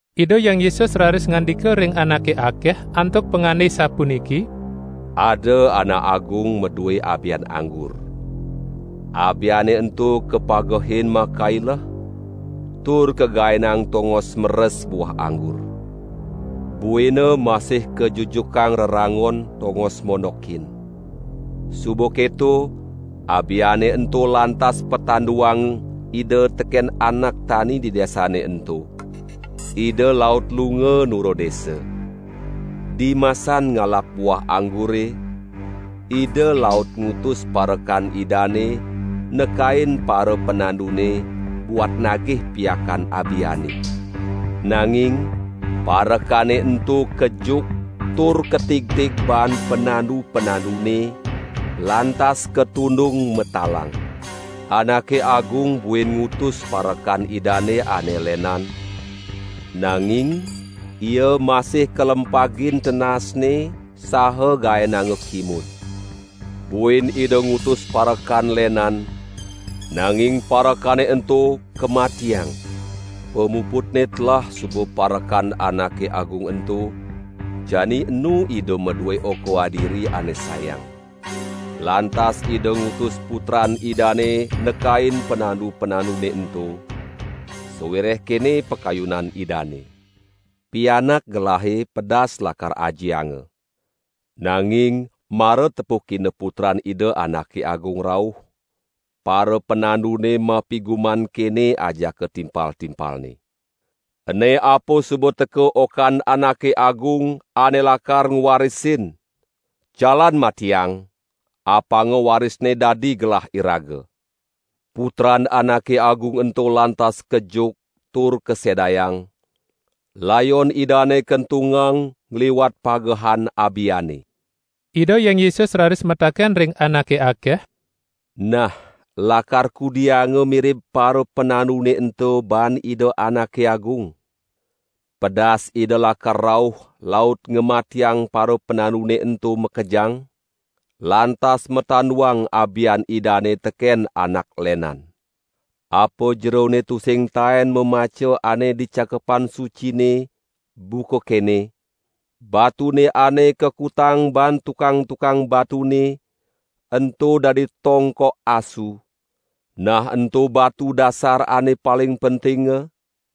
Ida Hyang Yesus raris ngandika ring anake akeh antuk pangande sapuniki: "Ada anak agung madue abian anggur. Abiane ento kapagehin makaileh tur kagaenang tongos meres buah anggur. Buina masih kajujukang reranggon tongos mondokin. Suba keto abiane ento lantas patanduang ida teken anak tani di desane ento. Ida laut lunga nura desa. Dimasan ngalap buah anggure, ida laut ngutus parekan idane nekain parapanandune buat nagih piakan abiane. Nanging parekane ento kejuk tur katigtig baan panandu-panandune, lantas katundung matalang. Anake agung buin ngutus parekan idane ane lenan, nanging ia masih kalempagin tendasne saha gaenanga kimud. Buin ida ngutus parekan lenan, nanging parekane ento kamatiang. Pamuputne telah suba parekan anake agung ento, jani enu ida madue oka adiri ane sayang. Lantas ida ngutus putran idane nekain panandu-panandune ento, sawireh kene pakayunan idane: 'Pianak gelahe pedas lakar ajianga.' Nanging mara tepukina putran ida anake agung rauh, parapanandune mapiguman kene ajaka timpal-timpalne: 'Ene apa suba teka okan anake agung ane lakar ngwarisin! Jalan matiang, apanga warisne dadi gelah iraga!' Putran anake agung ento lantas kejuk tur kasedayang, layon idane kentungang ngliwat pagehan abiane." Ida Hyang Yesus raris mataken ring anake akeh: "Nah, lakar kudianga mirib parapanandune ento baan ida anake agung? Pedas ida lakar rauh laut ngamatiang parapanandune ento makejang, lantas matanduang abian idane teken anak lenan. Apa jerone tusing taen mamaca ane di Cakepan Sucine, buka kene: Batune ane kakutang baan tukang-tukang batune, ento dadi tongkok asu, nah ento batu dasar ane paling pentinga?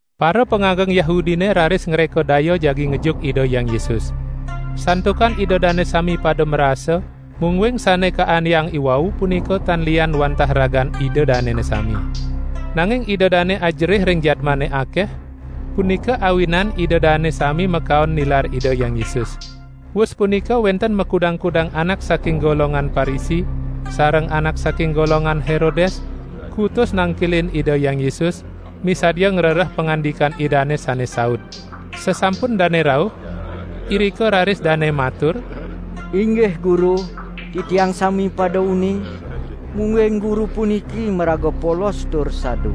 Parapangageng Yahudine raris ngreka daya jagi ngejuk Ida Hyang Yesus. Santukan ida dane sami pada marasa, mungguing sane kaandeang iwau punika tan liyan wantah ragan ida danene sami. Nanging ida dane ajerih ring jadmane akeh, punika awinan ida dane sami makaon nilar Ida Hyang Yesus. Wus punika wenten makudang-kudang anak saking golongan Parisi sareng anak saking golongan Herodes kutus nangkilin Ida Hyang Yesus, misadia ngrereh pangandikan Idane sane saud. Sasampun dane rauh, irika raris dane matur: "Inggih Guru, titiang sami pada uning, mungguing Guru puniki maraga polos tur sadu;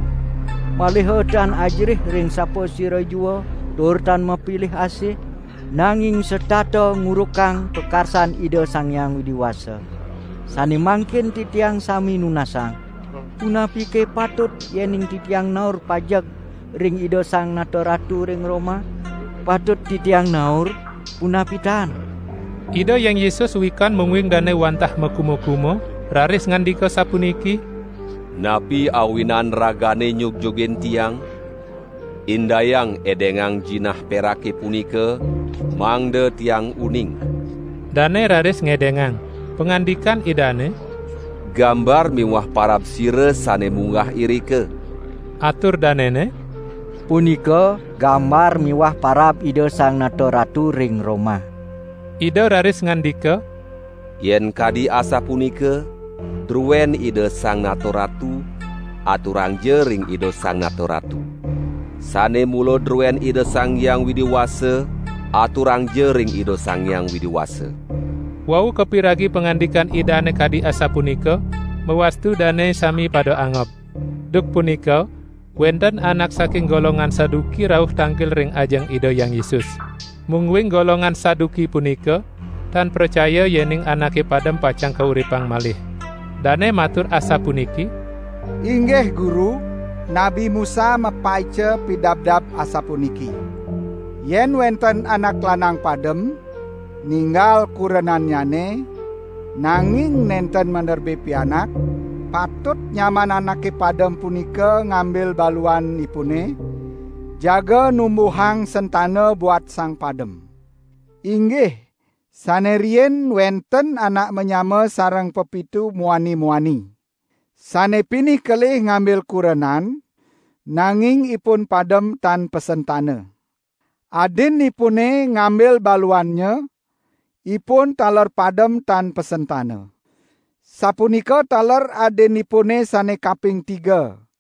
maliha tan ajerih ring sapasira jua tur tan mapilih asih, nanging setata ngurukang pakarsan Ida Sang Hyang Widi Wasa. Sane mangkin titiang sami nunasang: Punapike patut yening titiang naur pajeg ring Ida Sang Nata Ratu ring Roma? Patut titiang naur, punapi tan?" Ida Hyang Yesus wikan mungguing dane wantah makuma-kuma, raris ngandika sapuniki: "Napi awinan ragane nyugjugin Tiang? Indayang edengang jinah perake punika, mangda Tiang uning!" Dane raris ngedengang. Pangandikan Idane: "Gambar miwah parab sira sane munggah irika?" Atur danene: "Punika gambar miwah parab Ida Sang Nata Ratu ring Roma." Ida raris ngandika: "Yen kadi asapunika, druen Ida Sang Nata Ratu, aturangja ring Ida Sang Nata Ratu. Sane mula druen Ida Sang Hyang Widi Wasa, aturangja ring Ida Sang Hyang Widi Wasa!" Wau kapiragi pangandikan Idane kadi asapunika, mawastu dane sami pada angob. Duk punika wenten anak saking golongan Saduki rauh tangkil ring ajeng Ida Hyang Yesus. (Mungguing golongan Saduki punika tan pracaya yening anake padem pacang kauripang malih.) Dane matur asapuniki: "Inggih Guru, Nabi Musa mapaica pidabdab asapuniki: 'Yen wenten anak lanang padem ninggal kurenannyane, nanging nenten maderbe pianak, patut nyaman anake padem punika ngambil baluanipune, jaga numbuhang sentana buat sang padem.' Inggih, sane riin wenten anak manyama sareng pepitu muani-muani. Sane pinih kelih ngambil kurenan, nanging ipun padem tan pasentana. Adinipune ngambil baluannya, ipun taler padem tan pasentana. Sapunika taler adinipune sane kaping tiga.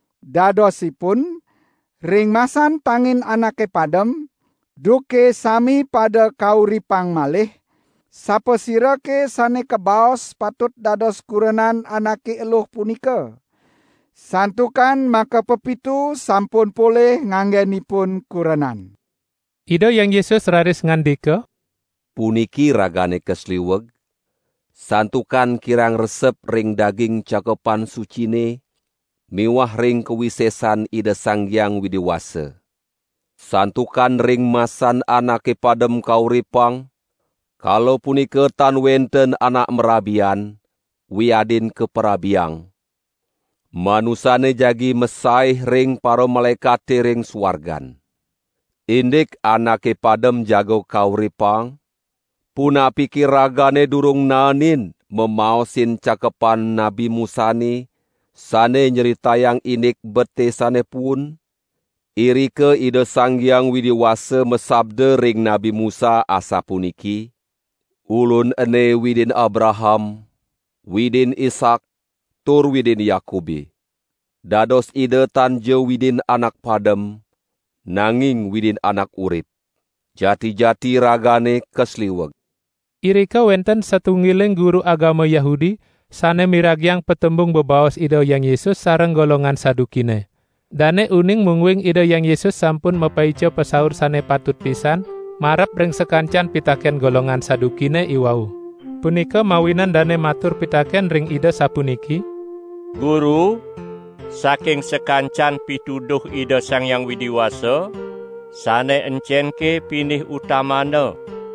Dadosipun, ring masan tangin anake padem, duke sami pada kauripang malih, sapasirake sane kabaos patut dados kurenan anake eluh punika? Santukan makapepitu sampun polih nganggenipun kurenan." Ida Hyang Yesus raris ngandika: "Puniki ragane kasliweg, santukan kirang resep ring daging Cakepan Sucine miwah ring kawisesan Ida Sang Hyang Widi Wasa. Santukan ring masan anake padem kauripang, kala punika tan wenten anak marabian, wiadin kaparabiang; manusane jagi masaih ring paramalaekate ring suargan. Indik anake padem jaga kauripang, punapike ragane durung naenin mamaosin Cakepan Nabi Musane sane nyritayang indik bete sane puun? Irika Ida Sang Hyang Widi Wasa masabda ring Nabi Musa asapuniki: 'Ulun ene Widin Abraham, Widin Ishak tur Widin Yakube!' Dados Ida tanja Widin anak padem, nanging Widin anak urip. Jati-jati ragane kasliweg." Irika wenten satunggiling guru agama Yahudi sane miragiang patembung bebaos Ida Hyang Yesus sareng golongan Sadukine. Dane uning mungguing Ida Hyang Yesus sampun mapaica pasaur sane patut pisan marep ring sakancan pitaken golongan Sadukine iwau. Punika mawinan dane matur pitaken ring Ida sapuniki: "Guru, saking sakancan pituduh Ida Sang Hyang Widi Wasa, sane encenke pinih utamana?"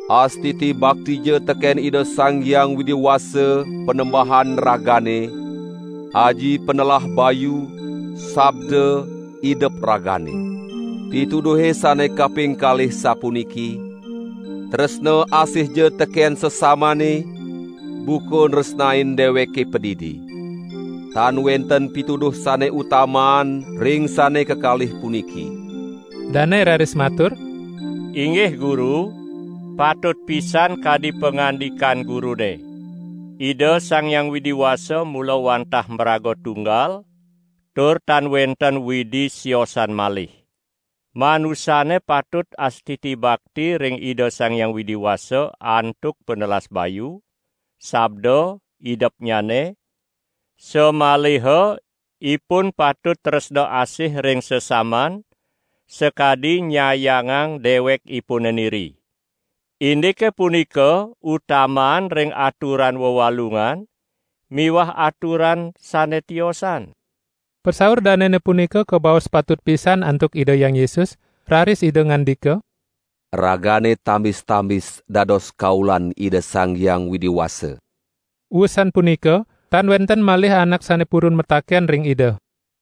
Astiti baktija teken Ida Sang Hyang Widi Wasa, Panembahan ragane aji panelah bayu, sabda, idep ragane!' Pituduhe sane kaping kalih sapuniki: 'Tresna asihja teken sesamane, buka nresnain deweke padidi!' Tan wenten pituduh sane utamaan ring sane kekalih puniki." Dane raris matur: "Inggih Guru, patut pisan kadi pangandikan Gurune! Ida Sang Hyang Widi Wasa mula wantah maraga tunggal tur tan wenten Widi siosan malih! Manusane patut astiti bakti ring Ida Sang Hyang Widi Wasa antuk panelas bayu, sabda, idepnyane, samaliha ipun patut tresna asih ring sesaman, sakadi nyayangang dewekipune niri. Indike punika utamaan ring aturan wewalungan miwah aturan sane tiosan." Pasaur danene punika kabaos patut pisan antuk Ida Hyang Yesus, raris Ida ngandika: "Ragane tambis-tambis dados kaulan Ida Sang Hyang Widi Wasa." Wusan punika tan wenten malih anak sane purun mataken ring Ida.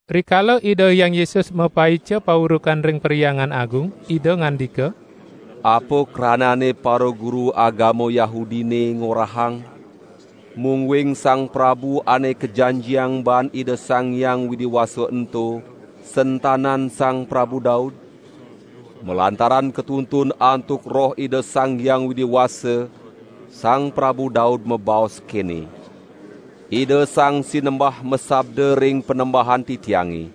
Rikala Ida Hyang Yesus mapaica paurukan ring Perhyangan Agung, Ida ngandika: "Apa kranane paraguru agama Yahudine ngorahang mungguing Sang Prabu Ane Kajanjiang baan Ida Sang Hyang Widi Wasa ento, sentanan Sang Prabu Daud? Malantaran katuntun antuk Roh Ida Sang Hyang Widi Wasa, Sang Prabu Daud mabaos kene: Ida Sang Sinembah masabda ring Panembahan titiange: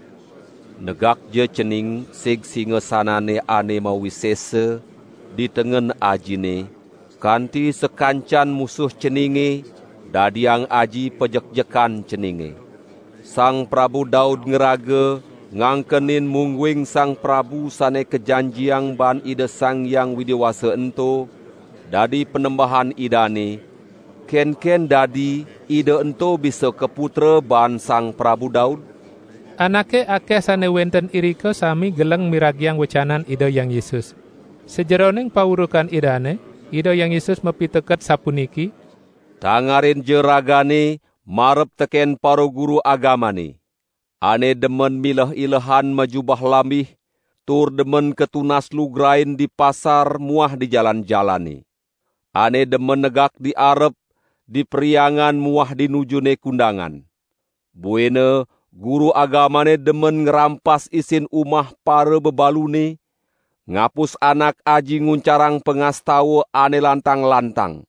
Negakja Cening sig singasanane ane mawisesa di tengen Ajine kanti sakancan musuh Ceninge dadiang Aji pajekjekan Ceninge!' Sang Prabu Daud ngraga ngangkenin mungguing Sang Prabu Sane Kajanjiang baan Ida Sang Hyang Widi Wasa ento dadi Panembahan idane, kenken dadi Ida ento bisa kaputra baan Sang Prabu Daud?" Anake akeh sane wenten irika sami geleng miragiang wecanan Ida Hyang Yesus. Sajeroning paurukan Idane, Ida Hyang Yesus mapiteket sapuniki: "Tangarinja ragane marep teken paraguru agamane, ane demen mileh-ilehan majubah lambih tur demen katunas lugrain di pasar muah di jalan-jalane. Ane demen negak di arep, di Perhyangan muah di nujune kundangan. Buina guru agamane demen ngrampas isin umah parabebalune, ngapus anak aji nguncarang pangastawa ane lantang-lantang.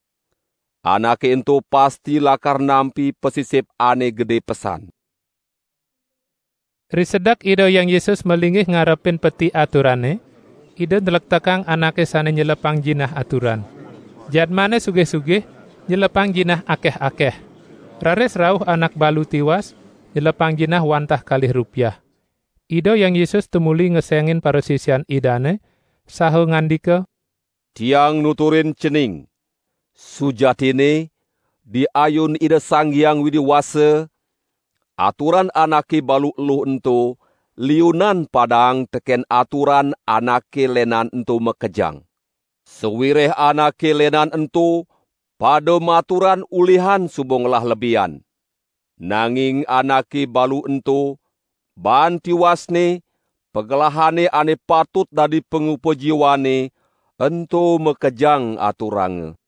Anake ento pasti lakar nampi pasisip ane gede pesan." Risedek Ida Hyang Yesus malinggih ngarepin peti aturane, Ida nlektekang anake sane nyelepang jinah aturan. Jadmane sugih-sugih nyelepang jinah akeh-akeh. Raris rauh anak balu tiwas, nyelepang jinah wantah kalih rupiah. Ida Hyang Yesus tumuli ngesengin parasisian Idane saha ngandika: "Tiang nuturin cening: Sujatinne di ayun Ida Sang Hyang Widi Wasa aturan anake balu eluh ento liunan padaang teken aturan anake lenan ento makejang. Sawireh anake lenan ento pada maturan ulihan suba ngelah lebihan, nanging anake balu ento, baan tiwasne, pagelahane ane patut dadi pangupajiwanne ento makejang aturanga."